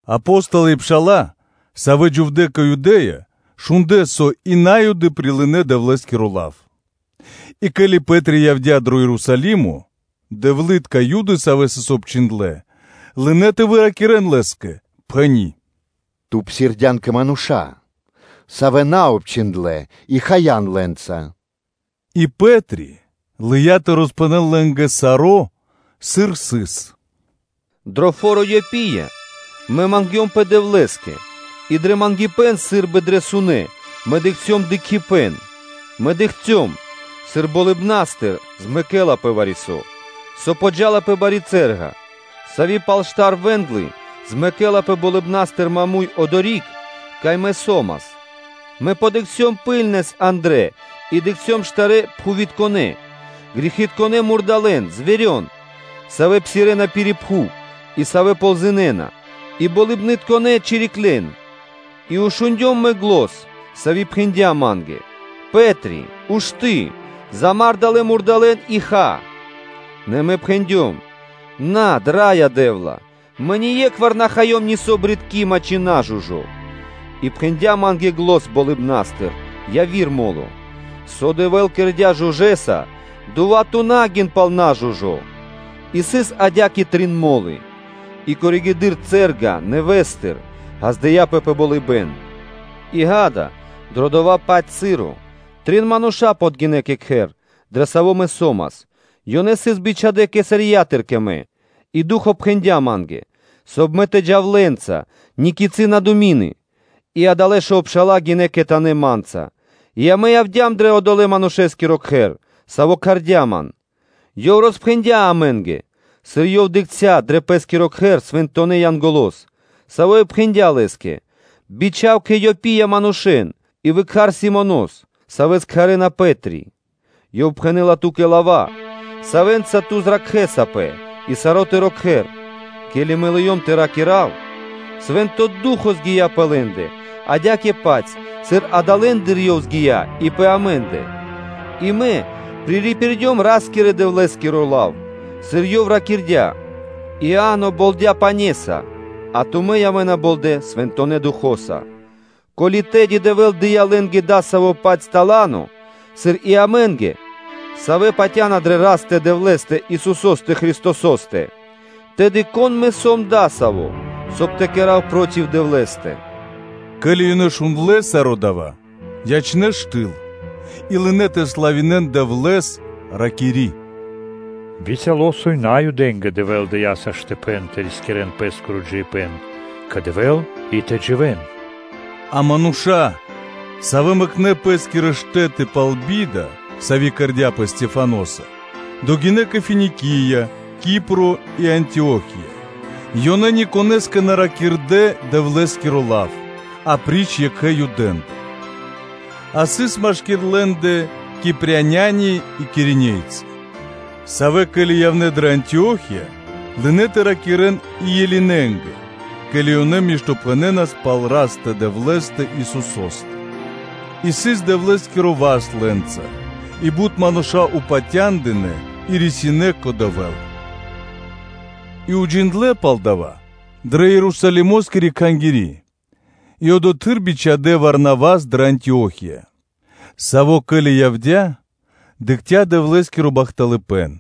Апо́столы и пша́ла, савэ́ дживдэ́ кэ Юдэ́я, шундлэ́, со и На́юды прилынэ́ Дэвлэ́скиро лав; и ке́ли Пэ́три явдя́ дро Ерусалимо, дэвлы́тка Юды, савэ́ сыс обчхиндлэ́, лынэ́ тэ выракирэн лэ́скэ, пхэни́: “Ту псирдян кэ мануша́, савэ́ исын наобчхиндлэ и хаян лэ́нца.” И Пэ́три лыя́ тэ роспхэнэл лэ́нгэ саро́, сыр сыс: “Дро фо́ро Иопия мэ мангдёмпэ Дэвлэ́скэ и дрэ мангипэ́н сы́рбы дрэ сунэ́ мэ дыкхцём дыкхибэ́н и издрандыём: мэ дыкхцём, сыр болыбна́стыр змэкэлапэ вари-со, со подджа́ла пэ бари цэ́рга, сави́ пал штар вэ́нглы змэкэлапэ болыбна́стыр маму́й (прямэс) одори́к, кай мэ со́мас: мэ задыкхцём ракхунэс андрэ́ и дыкхцём штарэ́ пхувитконэ – ґэритконэ мурдалэ́н (зверен), савэ́ псирэ́на пири́ пхув и савэ́ ползынэна, и болыбнытконэ чириклен. И шундём мэ зан, сави́ пхэндя́ ма́нгэ: “Пэ́тре! Ушты́, замар далэ́ мурдалэ́н и ха.” Нэ Мэ пхэндём: “Над, Раё Дэ́вла! Мэ ние́кхвар на хаём нисо́ джунгало́ (брытко) ци нажужо.” И пхэндя́ ма́нгэ зан болыбна́стыр яви́р мо́ло: “Со Дэвэ́л кэрдя́ жужэса, дова́ ту на гин пал нажужо.” И сыс адя́кэ трин мо́лы, и коригэды́р (позжэды́р) цэ́рга нэвэ́стыр ґаздыя́пэ пэ болыбэ́н; и ґа́да, дро дова́-паць часо, трин мануша́ подгинэ́ кэ кхэр, дрэ саво́ мэ со́мас, ёнэ сыс бичхадэ́ Кесариятыр кэ мэ. И Ду́хо пхэндя́ ма́нгэ, соб (кай) мэ тэ джав лэ́нца, никицы на думины. И адалэ́ шов пша́ла гинэ́ кхэтанэ́ ма́нца и амэ явдя́м дро одолэ́-манушэ́скиро кхэр, саво́ кхардя́ ман. Ёв роспхэндя́ амэ́нгэ, сыр ёв дыкхця́ дро пэ́скиро кхэр свэнтонэ́ Янголо́с, саво́ и пхэндя́ лэ́скэ: бичха́в кэ Иопия манушэ́н и выкхар Симонос, савэ́с кхарэ́на Пэ́три; ёв пхэнэ́ла ту́кэ лава́, савэ́нца ту зракхэсапэ и саро́ тыро́ кхэр.” Ке́ли мэ лыём тэ ракира́в, Свэ́нто Ду́хо (Фа́но) згия пэ лэ́ндэ, адя́кэ-паць, сыр англэды́р ёв згия и пэ амэ́ндэ. И Мэ пририпирдём Ра́скирэ-Дэвлэ́скиро лав, сыр Ёв ракирдя́: ‘Иа́но болдя пане́са, а тумэ́ явэ́на болдэ Свэнтонэ́ Духо́са’. Ко́ли тэды Дэвэ́л дыя́ лэ́нгэ дасаво-паць тала́но, сыр и амэ́нгэ, савэ́ патя́на дрэ Растэ-Дэвлэ́стэ, Исусо́стэ Христосо́стэ, тэды, кон мэ сом адасаво́, соб (кай) тэ кэра́в вари-со проти Дэвлэ́стэ?” Ке́ли ёнэ шундлэ́ саро́ дава́, ячнэ́ штыл и лынэ́ тэ славинэ́н Дэвлэ́с, ракири́: “Бицяло́, со и Наюдэ́нгэ Дэвэ́л дыя́ во́ля тэ рискирэ́н пэ́скиро джиибэ́н кэ Дэвэ́л и тэ дживэ́н.” А мануша́, савэ́ мэкнэ́ пэ́скирэ штэ́ты пал би́да, сави́ кэрдя́пэ Стехваноса, догинэ́ кэ Финикия, Кипро и Антио́хия, ёнэ никонэ́скэ на ракирдэ́ Дэвлэ́скиро лав, апри́ч екхэ Юдэ́ндэ. А сыс машки́р лэ́ндэ Кипряни и Киринейцы, савэ́, ке́ли явнэ́ дрэ Антио́хия, лынэ́ тэ ракирэ́н и Элинэнгэ (Грекэ́нгэ/Баламэ́нгэ), ке́ли ёнэ миштопхэнэнас пал Растэ-Дэвлэ́стэ Исусо́стэ. И сыс Дэвлэ́скиро васт лэ́нца, и бут мануша́ патяндынэ́ и рисинэ́ кэ Дэвэ́л. И уджиндлэ́ пал дава́ дрэ Ерусалимо́скири Кхангири́, и одотхы́р бичхадэ́ Варнавас дрэ Антио́хия: саво́, ке́ли явдя́, дыкхця́ Дэвлэ́скиро бахталыпэ́н,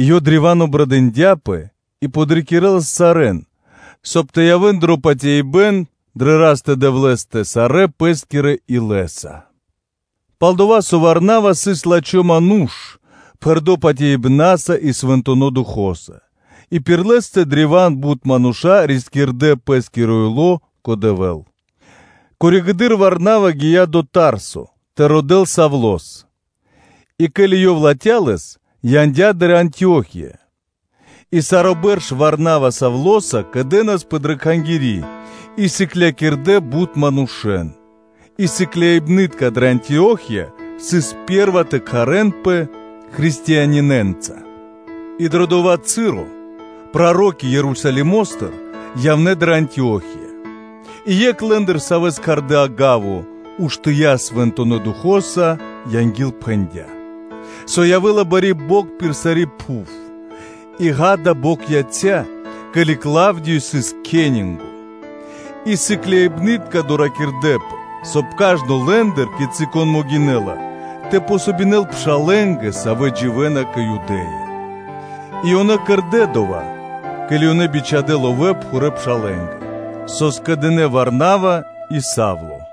и ёв древа́н обрадындяпэ и подрикирэлас сарэ́н, соб (кай) ёнэ тэ явэ́н дро патяибэ́н дрэ Растэ-Дэвлэ́стэ сарэ́ пэ́скирэ илэ́са; пал-дова́ со Варнава сыс лачхо́ ману́ш, пхэрдо́ патяибна́са и Свэнтонэ́ Духо́са, и пир лэ́стэ древа́н бут мануша́ рискирдэ́ пэ́скиро ило́ кэ Дэвэ́л. Коригэды́р Варнава гия́ дро Тарсо тэ родэ́л Савлос. И ке́ли ёв латхя́ лэс, то яндя́ дрэ Антио́хия. И саро́ бэрш Варнава Савлоса кэдэнаспэ дрэ Кхангири́ и сыклякирдэ́ бутэ́ манушэ́н: и сыкляибны́тка дрэ Антио́хия сыс пэ́рва тэ кхарэнпэ Дэвлытконэ́нца (Христианэ́нца). И дро дова́ часо проро́ки Ерусалимо́стыр явнэ́ дрэ Антио́хия; и екх лэ́ндыр, савэ́с кхардэ́ “Агаво”, уштыя́ и Свэнтонэ́ Духо́са ангилпхэндя, со явэ́ла бари бокх пир сари́ пхув, и, ґа́да, бокх яця́, ке́ли Клавдиё сыс кхенинго (кесарё). И сыкляибны́тка доракирдэпэ, соб (кай) кажно лэ́ндыр, кицы́ кон могинэ́ла, тэ помогинэл пшалэ́нгэ, савэ́ дживэ́на кэ Юдэ́я, И ёнэ кэрдэ́ дова́, ке́ли ёнэ бичхадэ́ ловэ́ пхурэпшалэнгэ (пресвитерэнгэ), со скэдынэ́ Варнава и Савло.”